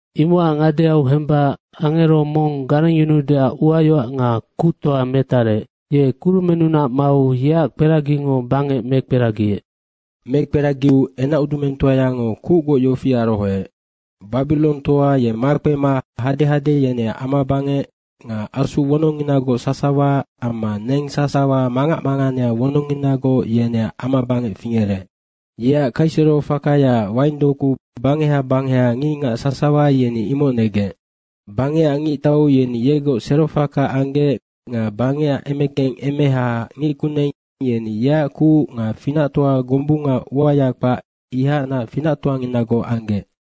Imocac ngadeau hemba angero mong garengyunuudeac uayoac nga kuctoa metarec, ye kurumennunac mau yeac kperagingo bangec mekperagiec. Mekperagiu enacudumengtoayango kucgoc yofi arohoec, “Babirongtoa ye makpema hadehade yeneac amabangec nga asu wonongnginagoc sasawa amma neng sasawa mangac manganea wonongnginagoc, yeneac amabangec fingerec. Yeac kaisero fakayaac waindoku bangeha bangeha ngicngac sasawa yeni imoc negec. Bangecac ngictau yeni yegoc serofaka anggec nga bangecac emekeng emehaac ngickuneng yeni yeac kuc nga finactoa gombunga uaya kpac, ihacnac finactoanginagoc anggec.”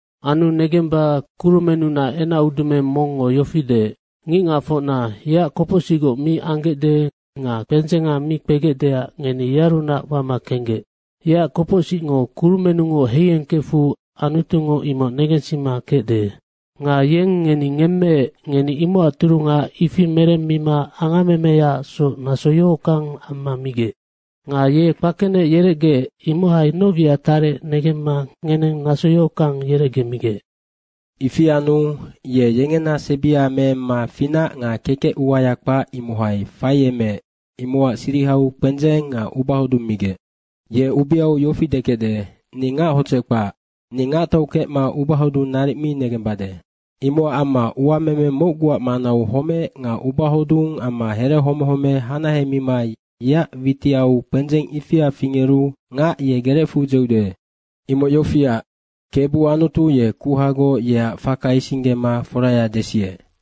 Anu negemba kurumennunac enacudumeng mongngo yofi deec, “Ngicngacfocna, yeac kopocsicgoc mi anggecde nga kpendzenga mi kpegecdeac ngeni yearunac wama kenggec. Yeac kopocsicngo kurumennungoc heiengkefu Anutungo imoc negensima kecde. Nga yeng ngeni ngemmeec, ngeni imocac turunga ifi meremmima angammemeyaacsoc naso yohockang amma migec. Nga ye kpakenec yerecgeec, imohai noc wiac tarec negemma ngeneng naso yohockang yerecgemigec. Ifi anu ye yengena sebia meemma finac nga kekec uaya kpac, imohai faiemeec, imocac sirihau kpendzeng nga ubahodung migec. Ye ubeau yofi dekecde, ‘Ni hodzec kpac, ni ngactau kecma ubahodung naric mi negembade.’ Imocac amma uameme mocguac manau homec nga ubahodung amma here homehome hanahemima yeac witiau kpendzeng ifia fingeru ngac ye gerecfu dzeude. Imoc yofiac, Kebu Anutu ye kuhagoc, yeac faka isinggema foraya desiec.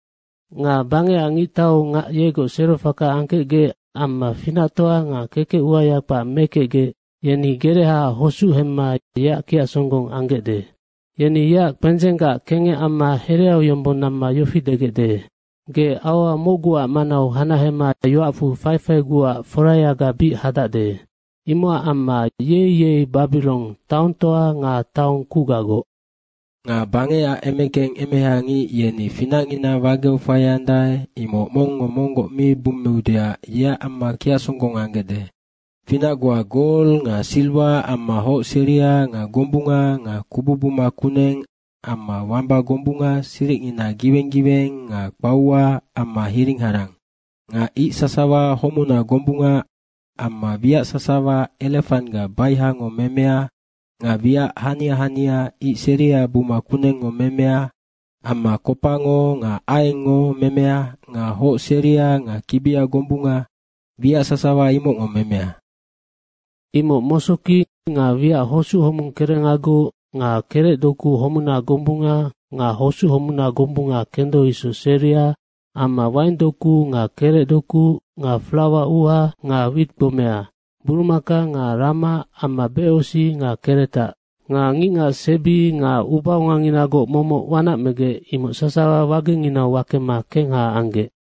Nga bangecac ngictau ngac yegoc serofaka angkecgec amma finactoa nga kekec uaya kpac mekecgec, yeni gerehaac hosuc hemma yeac kiacsonggong anggecde. Yeni yeac kpendzenggac kengec amma hereau yombong namma yofi degecde, ‘Ge aua mocguac manau hanahema yoacfu faifaiguac forayaga bic hadacde. Imocac amma yei yei Babirong, ge taongtoa nga taong kucgagoc.’ Nga bangecac emekeng emehangic yeni finacngina wageu faiandae, imoc mongngo monggoc mi bummeudeac yeac amma kiacsonggong anggecde. Finac goa, gol nga siriwa amma hoc seria nga gombunga nga kubu buma kuneng amma wamba gombunga siricngina giweng giweng nga kpaua amma hiring harang. Nga ic sasawa homuna gombunga amma wiac sasawa erefanggac baihango memea nga wiac hania hania ic seria buma kunengngo memea amma kopango nga aiengngo memea nga hoc seria nga kibia gombunga wiac sasawa imocngo memea. Imoc mosoki nga wiac hosuc homung kerengagoc nga kerecdoku homuna gombunga nga hosuc homuna gombunga kendo isoc seria amma waingdoku nga kerecdoku nga flawa uuha nga wit gbomea. Burumaka nga rama amma becosic nga keretac. Nga ngicngac sebi nga ubaonganginagoc momoc wanac megec, imoc sasawa wagenginau wakema kengha anggec.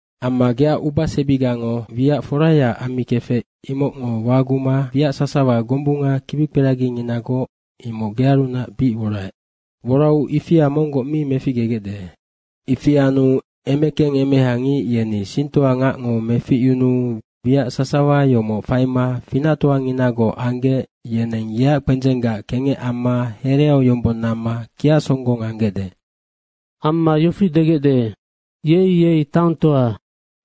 Amma geac ubasebigango wiac forayaac ammikefec, imocngo waguma wiac sasawa gombunga kibikperaginginagoc, imoc gearunac bic woraec. Worau ifia monggoc mi meficgegecde. Ifi anu emekeng emehangic yeni singtoangacngo meficyunuu wiac sasawa yomoc faima finactoanginagoc anggec, yeneng yeac kpendzenggac kengec amma hereau yombong namma kiacsonggong anggecde. Amma yofi degecde, ‘Yei yei taongtoa,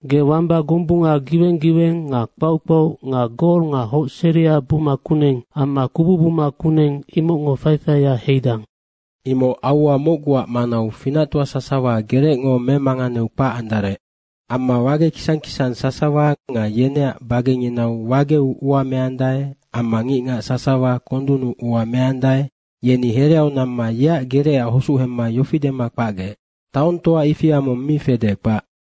ge wamba gombunga giweng giweng nga kpauc kpauc nga gol nga hoc seria buma kuneng, amma kubu buma kuneng, imocngo faifaia heidang. Imoc aua mocguac manau finactoa sasawa gerecngo memanganeu kpac andarec.’ Amma wage kisang kisang sasawa nga yeneac bagenginau wageu ua meandae amma ngicngac sasawa kondunnu ua meandae, yeni hereau namma yeac gerecac hosuc hemma yofi dema kpacgec, ‘Taongtoa ifia mong mi fede, kpac.’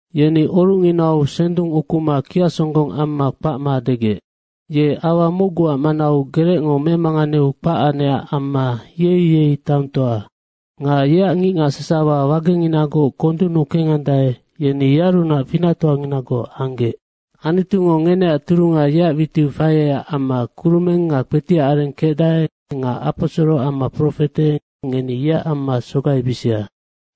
Yeni orucnginau sendung ukuma kiacsonggong amma kpacma degec, ‘Ye aua mocguac manau gerecngo memanganeu kpac anecac amma, yei yei taongtoa. Nga yeac ngicngac sasawa wagenginagoc kondunnu kengandae, yeni yearunac finactoanginagoc anggec.’ Anutungo ngeneac turunga yeac witiu faiecac amma kurumeng nga kpetiac areng kecdae nga aposoro amma profete, ngeni yeac amma sogaibisia.”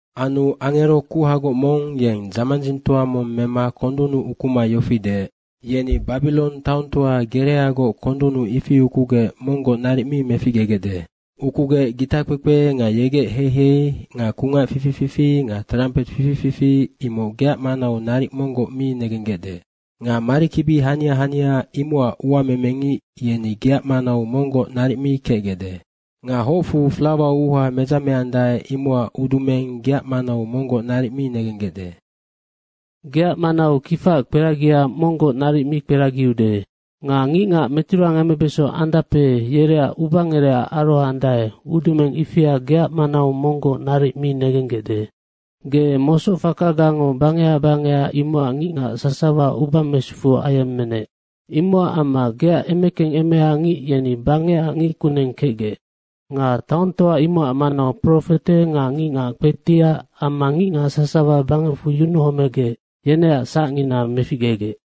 Anu angero kuhagoc mong, yeng dzamandzingtoa mong mema kondunnu ukuma yofi deec, “Yeni Babirong taongtoa gereagoc kondunnu ifi ukugec monggoc naric mi meficgegecde. Ukugec gitakpekpe nga yegec heihei nga kungac fifi fifi nga trampet fifi fifi, imoc geac manau naric monggoc mi negenggecde. Nga marikibi hania hania imocac uamemengic, yeni geac manau monggoc naric mi kecgecde. Nga hocfu flawa uuha medzameandae, imocac udumeng geac manau monggoc naric mi negenggecde. Geac manau kifaac kperagia monggoc naric mi kperagiude. Nga ngicngac meturangemebeso andape, yereac ubangerecac arohoandae, udumeng ifia geac manau monggoc naric mi negenggecde. Ge mosoc fakagango bangeha bangeha imocac ngicngac sasawa uba mesufu ayemmenec. Imocac amma geac emekeng emehangic yeni bangecac ngickuneng kecgec. Nga taongtoa imocac manau profete nga ngicngac kpetiac amma ngicngac sasawa bangecfu yunuhomegec, yeneac sacngina meficgegec.”